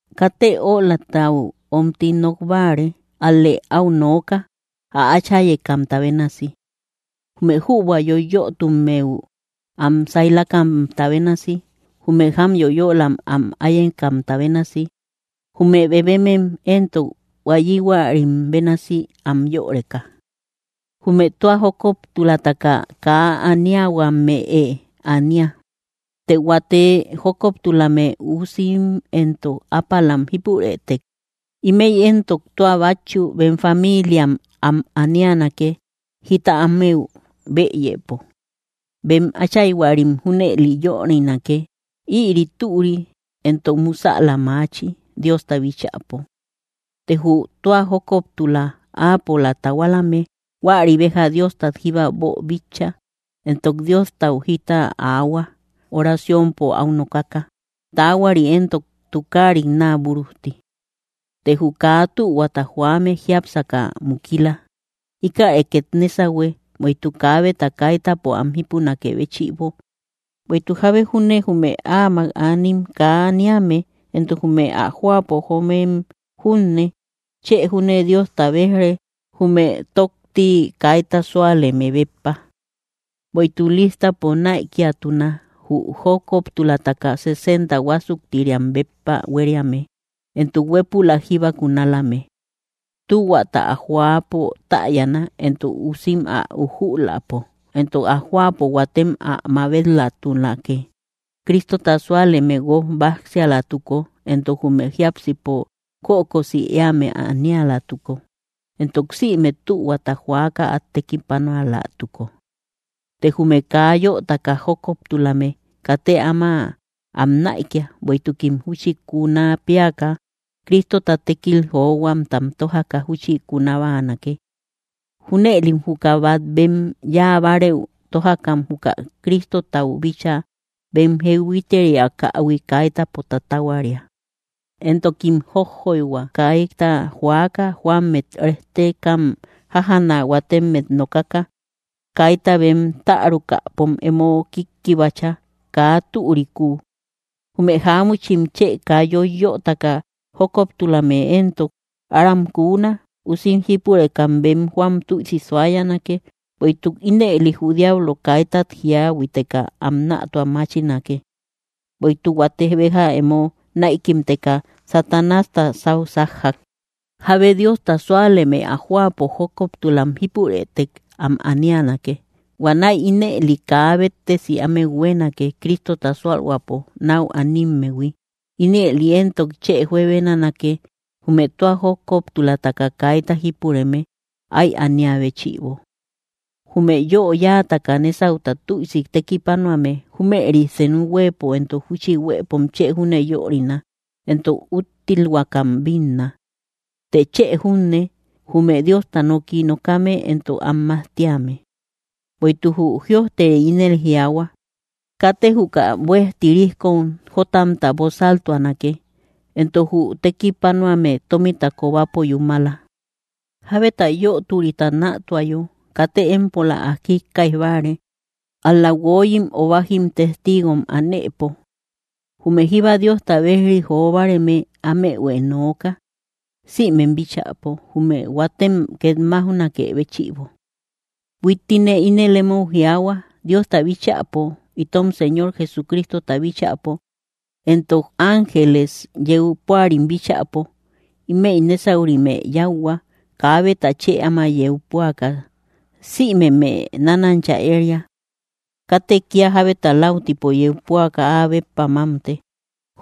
Katë ölatau omti nok báare, ál‑lë áu nooka, ä áchayekamta bénasi. Jume jübua yoyötummeu, am saylakamta bénasi. Jume jám yoyölam am áyekamta bénasi, jume bebemem éntok, huayihuarim bénasi, am yöreka. Jume tua jókoptulataka kaa aniahuame ania. Të huate jókoptulame usim entok ápalam jípurëtek, ímëi éntok tua bátchu bem famiilia am anianake, jita ámeu bëyëpo; bem áchayhuarim junëli yörinake. Ïri türi, entok musäla maachi, Diosta bíchäpo. Të jü tua jókoptula, áapola tahualame, huäri béja Diostat jíba boobíchaïhui, entok Diostau jita aahua, oraciompo aú nokaka, taahuari entok tukaarit naa búrujti. Te jü kaa tühuata joame jiápsaka mukila. Íkäre két nésahue, bueïtuk kaabeta kaitäpo am jipunakë béchïbo. Bueïtuk jábe júne jume áamak anim kaa aniame, entok jume ä jóapo joomem junne, chë júne Diosta béj‑re, jume tókti kaita súaleme béppa. Bueïtuk lístapo näikiatuna, jü jókoptulataka sesenta huásuktiriam béppa huériame, entok huépülak jíba kunalame. Tühuata ä joäpo täyana, entok usim ä ujüläpo, entok ä jóapo huatem mabet‑latunake, Cristota súaleme guók báksialatuko, entok jume jiápsipo kökosi éame anialatuko, entok sïme tühuata joaka át tekipanualatuko. Të jume kaa yötaka jókoptulame, katë áma am näikia; bueïtukim júchi kuna péaka Cristota tékilta johuamtam tójaka júchi kuna báanake. Júnëlim juka bat bem yáabareü tojakam juka Cristotau bíchaa bem jehuiteriakähui kaitäpo tatahuaria. Entokim jójjoyhua, kaita joaka; jóammet rejtekam jájaana, huatemmet nokaka. Kaita bem tärukäpom emo kíkkibacha, kaa türikuu. Jume jáamuchim chë kaa yoiyötaka jókoptulame éntok, aram kuuna. Usim jípurekam bem jóam tüisi suayanake. Bueïtuk ínëli jü diablo kaitat jíahuiteka am nätua máchinake. Bueïtuk huate béja emo näikimteka Satanásta sáu sájjak. Jábe Diosta súaleme ä jóapo jókoptulame jípurëtek, am anianake. Huanäi ínëli kaa béttesi ámeu huéenake, Cristota sualhuäpo nau animmehui, ínëli entok chë juebenanake, jume tua jókoptulataka kaita jípureme ái ania béchïbo. Jume yö yáataka nésauta tüisi tekipanuame, júmëri senu huëpo entok júchi huepom chë júne yörina entok úttilhuakam bínna; të chë junne, jume Diosta noki nokame, entok am majtíame. Bueïtuk jü jïojteri ínel jiaahua: “Katë juka buej tirijkom jótamta bosaltuanake.” Entok: “Jü tekipanuame tómita kobapo yúmala.” Jábeta yöturita nätuayo, katë empola ä jíkkaij báare, ál‑la, guoyim o bájim testigom anëpo. Jume jíba Diosta bejri jo báareme, ámehuë nooka, sïmem bíchäpo, jume huatem két máujnakë béchïbo. Huittine ínel emou jiaahua, Diosta bíchäpo, itom Señor Jesucristota bíchäpo, entok ángeles yeu púarim bíchäpo: Ímëi nésaurimë yáuhua, kaabeta chë áma yeu púaka; sïmemë nánancha éria. Katë kía jábeta läutipo yeu púaka áa béppa mámte.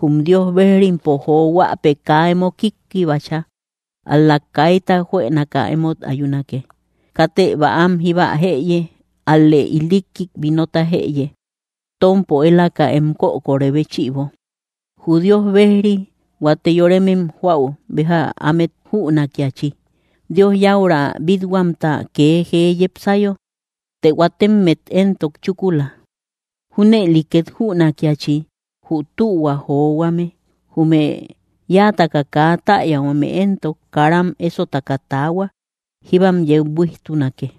Jum Dios bejrimpo johuäpë kaa emo kíkkibacha; ál‑la kaita juënaka emót ayunake. Katë bäam jíba jëye; ál‑lë ilikkik vinota jëye, tómpo élaka em kökorë béchïbo. Jü Dios bejri huate yoremem joäu béja ámet jünakiachi, Dios yäura bít-huamta kee jee yepsayo; të huatemmet éntok chúkula. Júnëli két jünakiachi, jü tühua johuame. Jume yáataka kaa täyahuame éntok, karam ésotaka taahua; jíbam yeu buíjtunake.